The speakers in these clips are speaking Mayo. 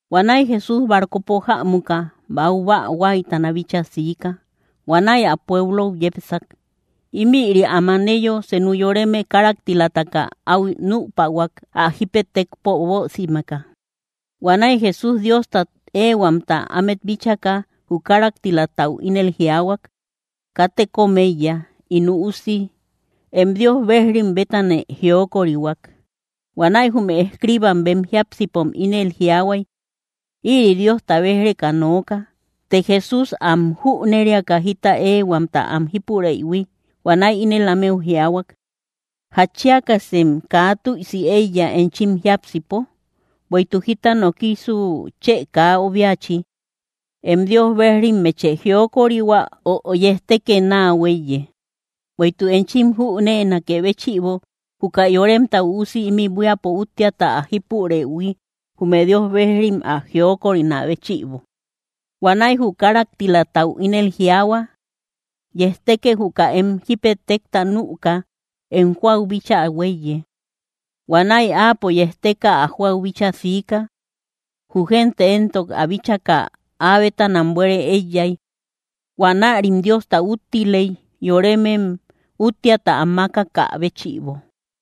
Huanäi Jesús barcopo jämuka, baubäa huáytana bíchaa siika. Huanäi ä pueblou yepsak. Ímïri am aneyo, senu yoreme káraktilataka áu nüpahuak, ä jípetekpo bösimeka. Huanäi Jesús Diostat éehuamta ámet bíchaka, jü káraktilatau ínel jiaahuak: —Katë kóm éiya, ín üusi; em Dios bejrim bétanë jiokorihuak. Huanäi jume escriibam bem jiápsipom ínel jiaahuay: “Ïri Diosta béj‑reka nooka.” Të Jesús am jüneriaka jita éehuamta am jípureïhui huanäi ínel ámeu jiaahuak: —¿Jatchiakasem kaa tüisi éiya enchim jiápsipo? Bueïtuk, ¿jita nokisu chë kaa obiachi: “Em Dios bejrimmeche jiokorihua”, ö “Yejtekë náa huéiye”? Bueïtuk enchim jüneenakë béchïbo, juka Yoremta Üusi ímï buíapo úttiata ä jípurëhui, jume Dios bejrim ä jiokorinakë béchïbo. Huanäi jü káraktilatau ínel jiaahua: —Yejtekë juka em jípetekta nüka, em jóau bíchaa huéiye. Huanäi áapo yejteka, ä jóau bíchaa siika. Jü gente éntok ä bíchaka, áa bétanam buere éiyay. Huanärim Diosta úttiley, yoremem úttiata am mákakä béchïbo.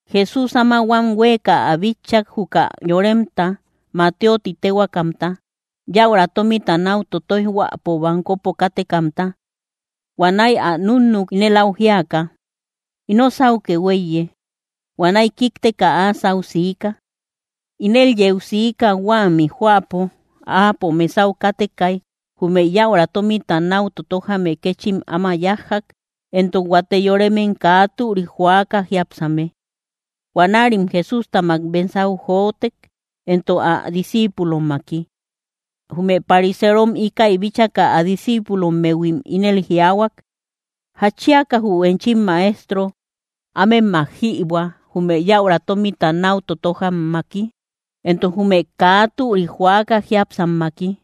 Jesús áma huan huéeka ä bitchak juka yoremta Mateo ti téhuaakamta, yäura tómita náu totoijhuäpo bankopo kátekamta. Huanäi ä núnnuk, ínel áu jíaka: —Ino sáukë huéiye. Huanäi kíkteka áa sáu siika. Ínel yeu siika, huämi jóapo, Áapo mesau kátekay, jume yäura tómita náu totojame kéchim áma yájjak, entok huate yoremem kaa türik joaka jiápsame. Huanärim Jesústamak mesau jotek, entok ä discíipulommaki. Jume pariserom íkäi bíchaka, ä discíipulommehuim ínel jiaahuak: —¿Jatchiaka jü enchim Maestro ámemak jïbuä, jume yäura tómita náu totojammaki entok jume kaa türik joaka jiápsammaki?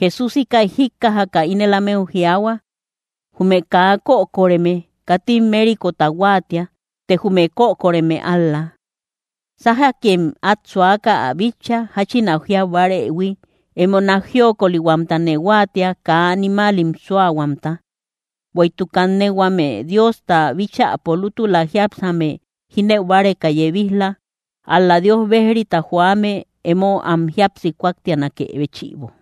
Jesús íkäi jíkkajaka ínel ámeu jiaahuak: —Jume kaa kökoreme katim mérikota huáatia; të jume kökoreme ál‑la. Sájakem át suaka ä bitcha, jáchin ä jiau bárëhui: “Emo nák jiokolihuamtane huáatia; kaa animaalim súahuamta.” Bueïtuk kanne huame Diosta bíchäpo lútula jíapsame jínëu báreka yebij‑la, ál‑la Dios bejrita joame, emo am jíapsi kúaktianakë béchïbo.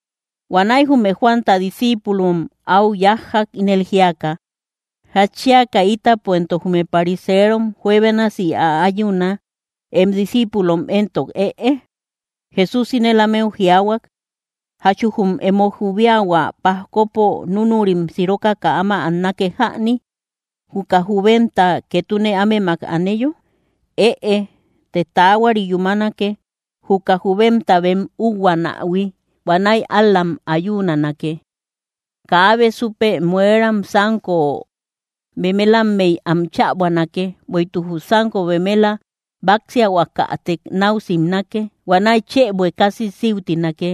Huanäi jume Juanta discíipulom áu yájjak, ínel jíaka: —¿Jatchiaka ítapo entok jume pariserom juebénasi äayuna, em discíipulom éntok ëe? Jesús ínel ámeu jiaahuak: —¿Jachu jum emo jubiahua pajkopo núnurim sirokaka áma annake jäni, juka jubemta ketune ámemak aneyo? Ëe, të taahuari yúmanake, jüka jubemta bem uhuanähui, huanäi ál‑lam ayuunanake. ’Kaabe súpe mueram sánko bemelamey am chäbuänake; bueïtuk jü sánko beméla báksiahuakätek náu simnake, huanäi chë buekasi síutinake.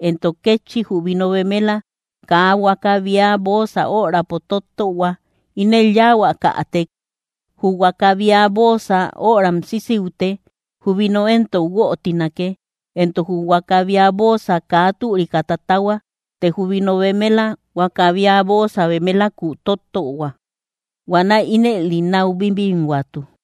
Entok kétchi jü vino bemela kaa huakäbia bóosa örapo tottöhua, ínëli yáahuakätek jü huakäbia bóosa öram síusiute; jü vino entok guötinake, entok jü huakäbia bóosa kaa türika tatahua, të jü vino bemela, huakäbia bóosa bemelaku tottöhua. Huanäi ínëli náu bibinhuatu.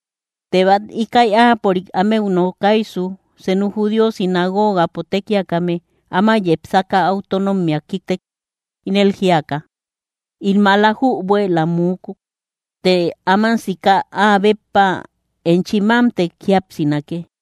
Të bát íkäi áapörik ámeu nokaysu, senu judío sinagogapo tekiakame áma yepsaka áu tónnommea kíktek, ínel jíaka: —In maala jübuëla muukuk; të áman sika áa béppa enchi mámtek jíapsinake.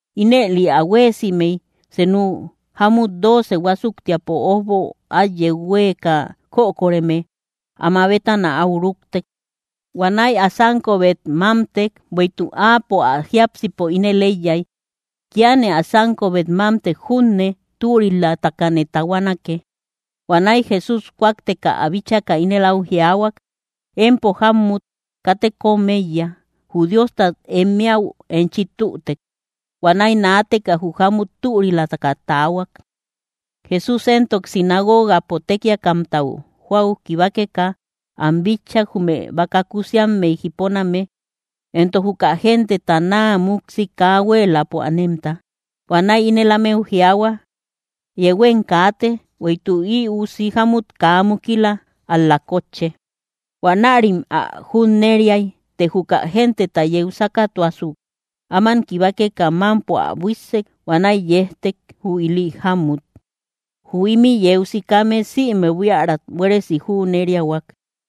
Ínëli ä huéesimey, senu jámut dooce huásuktiapo ójbo át yeu huéeka kökoreme áma bétana áu rúktek. Huanäi ä sánkobet mámtek. Bueïtuk áapo ä jiápsipo ínel éiyay: “Kíane ä sánkobet mámtek junne, türilatakane tahuanake.” Huanäi Jesús kúakteka ä bíchaka ínel áu jiaahuak: —Empo jámmut, katë kóm éiya. Jü Diostat em éäu enchi tütek. Huanäi naateka jü jámut türilataka taahuak. Jesús éntok sinagogapo tekiakamtau jóau kibakeka am bitchak, jume baka kusiammey jiponame entok juka genteta naa múksi kaa huéeläpo anemta. Huanäi ínel ámeu jiaahuak: —Yehuem kaate, bueïtuk ï usi jámut kaa mukila, ál‑la kótche. Huanärim ä junneriay. Të juka genteta yeu sákatuasuk, áman kibakeka, mámpo ä buíssek. Huanäi yejtek, jü ili jámmut. Jü ímï yeu sikame sïme buíärat buéresi jüneriahuak.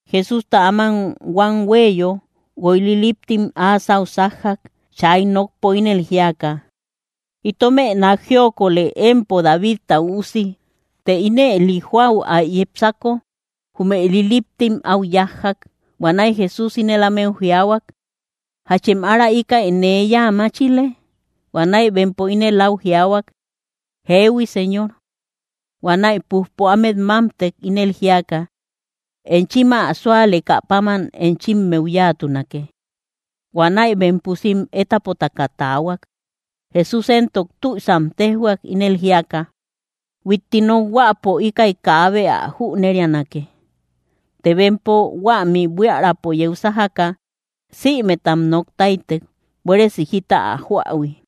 Jesústa áma huam huéeyo, guoy liliptim áa sáu sájjak, chay nokpo ínel jíaka: —¡Itomë nák jíokole, empo Davidta Üusi! Të ínëli jóau ä yepsako, jume liliptim áu yájjak. Huanäi Jesús ínel ámeu jiaahuak: —¿Jachem ára íkäi nee yáa máchile? Huanäi bempo inëlim áu jiaahuak: —Jehui, Señor. Huanäi pújpo ámet mámtek, ínel jíaka: —Enchim ä súalekä páman enchimmeu yáatunake. Huanäi bem pusim étapotaka taahuak. Jesús éntok tüisam téjhuak, ínel jíaka: —Huitti nokhuäpo íkäi kaabe ä jüneríanake. Të bempo huämi buiärapo yeu sájaka, sïmetam nok táytek, buéresi jita ä joähui.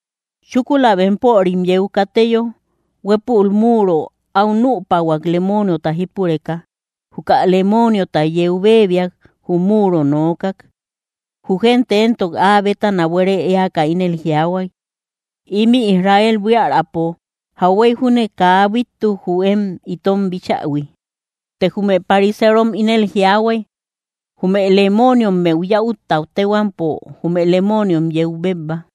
Chúkula bempörim yeu kateyo, huépul muro áu nüpahuak, lemooniota jípureka. Juka lemooniota yeu béebiak, jü muro nookak. Jü gente éntok áa bétana buére éaka ínel jiaahuay: —Ímï Israel buiärapo, ¡jauhuey júne kaa bíttuk jü én itom bíchähui! Të jume pariserom ínel jiaahuay: —Jume lemooniommeu yäutta téhuampo jume lemooniom yeu bébba.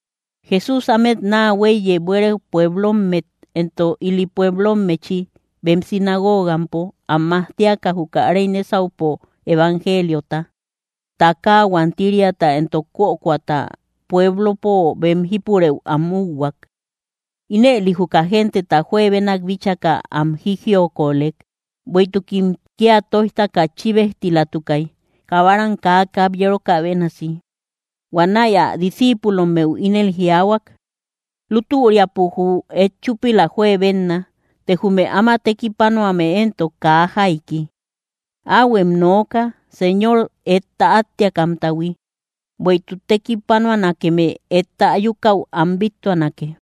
Jesús ámet naa huéiyey buére pueblommet entok ili pueblommechi, bem sinagogampo am majtiaka juka réy nésaupo evangeliota; takaa huantiriata entok kökoata pueblopo bem jípurëu am úhuak. Ínëli juka genteta juebenak bíchaka, am jijiokolek, bueïtukim kía tóijtaka chíbejtilatukay, kabaram kaa kabyerokä bénasi. Huanäi ä discíipulommeu ínel jiaahuak: —Lútüriapo jü et chúpila juebenna, të jume áma tekipanuame éntok kaa jaiki. Áhuem nooka, Señor etta áttiakamtahui, bueïtuk tekipanuanakeme etta ayukäu am bíttuanake.